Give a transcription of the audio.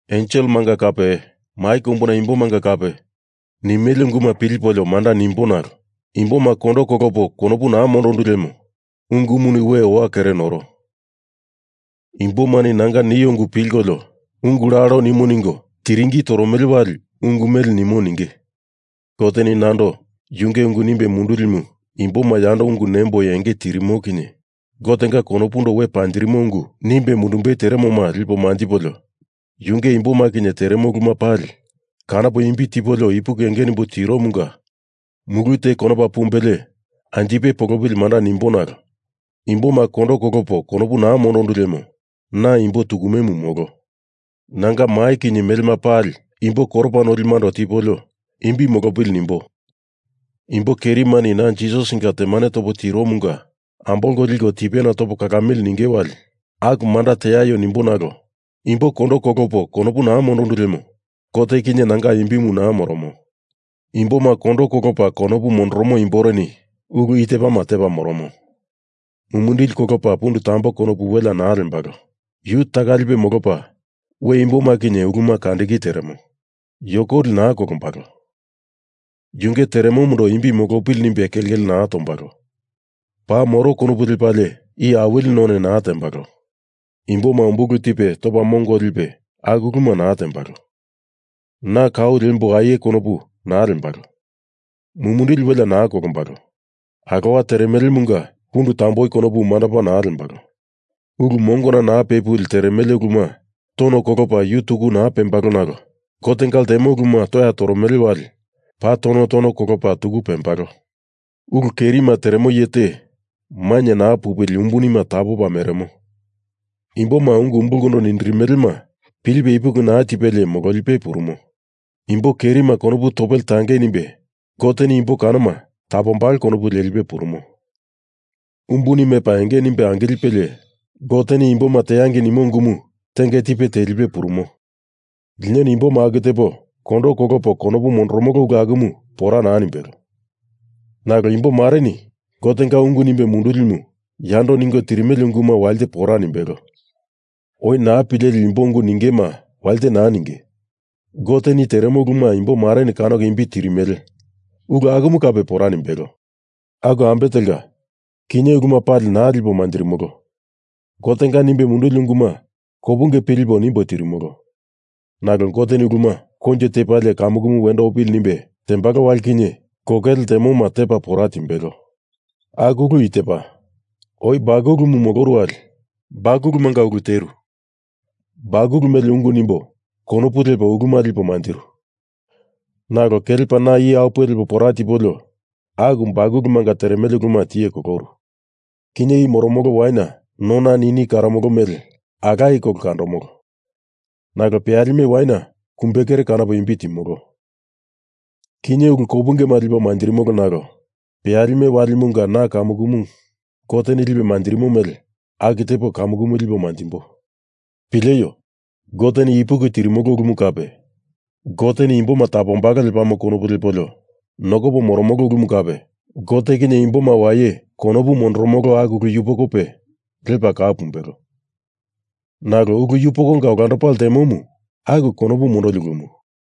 Enselemanga kape mai kombu imbomanga kape nimele unguma pilipolio manda nimbo nalo imboma kondo kolopo konopu naa mondondu lemo ungumuni we owa kere noro. Imbomani nanga nio ungu pilkolio ungu lalo nimo ningo tiringi toromele wali ungu mele nimo ninge. Goteni nando yunge ungu nimbe mundulimu imboma yando ungu nemboi enge tirimo kinye Gotenga konopundo we panjirimo ungu nimbe mundumbei teremoma lipo manjipolio yunge imboma kinye teremo uluma pali kanopo imbi tipolio ipuki enge nimbo tiromunga mulu te konopa pumbelie anjipe polopili manda nimbo nalo imboma kondo kolopo konopu naa mondondu lemo na imbo tukumemu molo. Nanga mai kinye melema pali imbo koropa nolimando tipolio imbi molopili nimbo imbo kerimani na Jisasinga temane topo tiromunga ambolko liko tipena topo kalamili ninge wali aku manda teaio nimbo nalo imbo kondo kolopa konopu naa mondondu lemo Gote kinye nanga imbimu naa moromo. Imboma kondo kolopa konopu mondoromo imboreni ulu i tepama tepa moromo. Mumindili kolopa pundu tamboi konopu welea naa lembalo. Yu taka lipe molopa we imboma kinye uluma kandiki teremo. Yokoli naa kolombalo. Yunge teremomundo imbi molopili nimbe kelkele naa tombalo. Paa moro konopu lepalie iye awili none naa tembalo. Imboma umbulu tipe topa mongo lipe aku ulu naa tembalo. Na kau liembo aie konopu naa lembalo. Mumindili welea naa kolombalo. Alowa teremelemunga pundu tomboi konopu mandopa naa lembalo. Ulu mongona naa pepuli teremele uluma tono kolopa yu tuku naa pembalo nalo Gotenga ltemo uluma toya toromele wali paa tono tono kolopa tuku pembalo. Ulu kerima teremo iye te mainye naa pupili umbuni tapopa meremo. Imboma ungu umbulkondo nindirimelema pilipe ipuki naa tipelie mololipe purumo. Imbo kerima konopu topele tangei nimbei Goteni imbo kanoma tapombalo konopu lelipe purumo. Umbuni mepa enge nimbe angilipelie Goteni imboma teangei nimo ungumu tenge tipe telipe purumo. Linoni imboma aku tepo kondo kolopo konopu mondoromolo ulu akumu pora naa nimbelo. Nalo imbomareni Gotenga ungu nimbe mundulimu yando ningo tirimele unguma walite pora nimbelo. Oi naa pileli imbo ungu ningema walite naa ninge. Goteni teremo uluma imbomareni kanoko imbi tirimele ulu akumu kape pora nimbelo. Aku ambe telka, kinye uluma pali naa lipo manjirimolo. Gotenga nimbe munduli unguma kopunge pilipo nimbo tirimolo. Nalo Goteni uluma koinjo tepalie kamukumu wendo opili nimbe tembalo wali kinye kokele ltemoma tepa pora timbelo. Aku ulu i tepa, oi bakulumu moloru wali bakulumanga ulu teru. Bakulu mele ungu nimbo konopu lepo uluma lipo manjiru. Nalo kelepa na iye apuwe lepa pora tipolio aku bakulumanga teremele uluma tiye koloru. Kinye i moromolo waina nona nini karomolo mele alaye kolo kandomolo. Nalo peyalime waina kumbekere kanopo imbi timolo. Kinye uluma kopunge lipo manjiro nalo peyalime walimunga na kamukumu Goteni lipe manjirimo mele aku tepo kamukumu lipo manjimbo. Pileio! Goteni ipuki tirimolo ulumu kape Goteni imboma tapombalo lepamo konopu lepolio nokopo moromolo ulumu kape Gote kinye imboma waye konopu mondoromolo aku ulu yupokope lepa kau pumbelo. Nalo ulu yupokonga olandopa ltemomu aku konopu mondoli ulumu.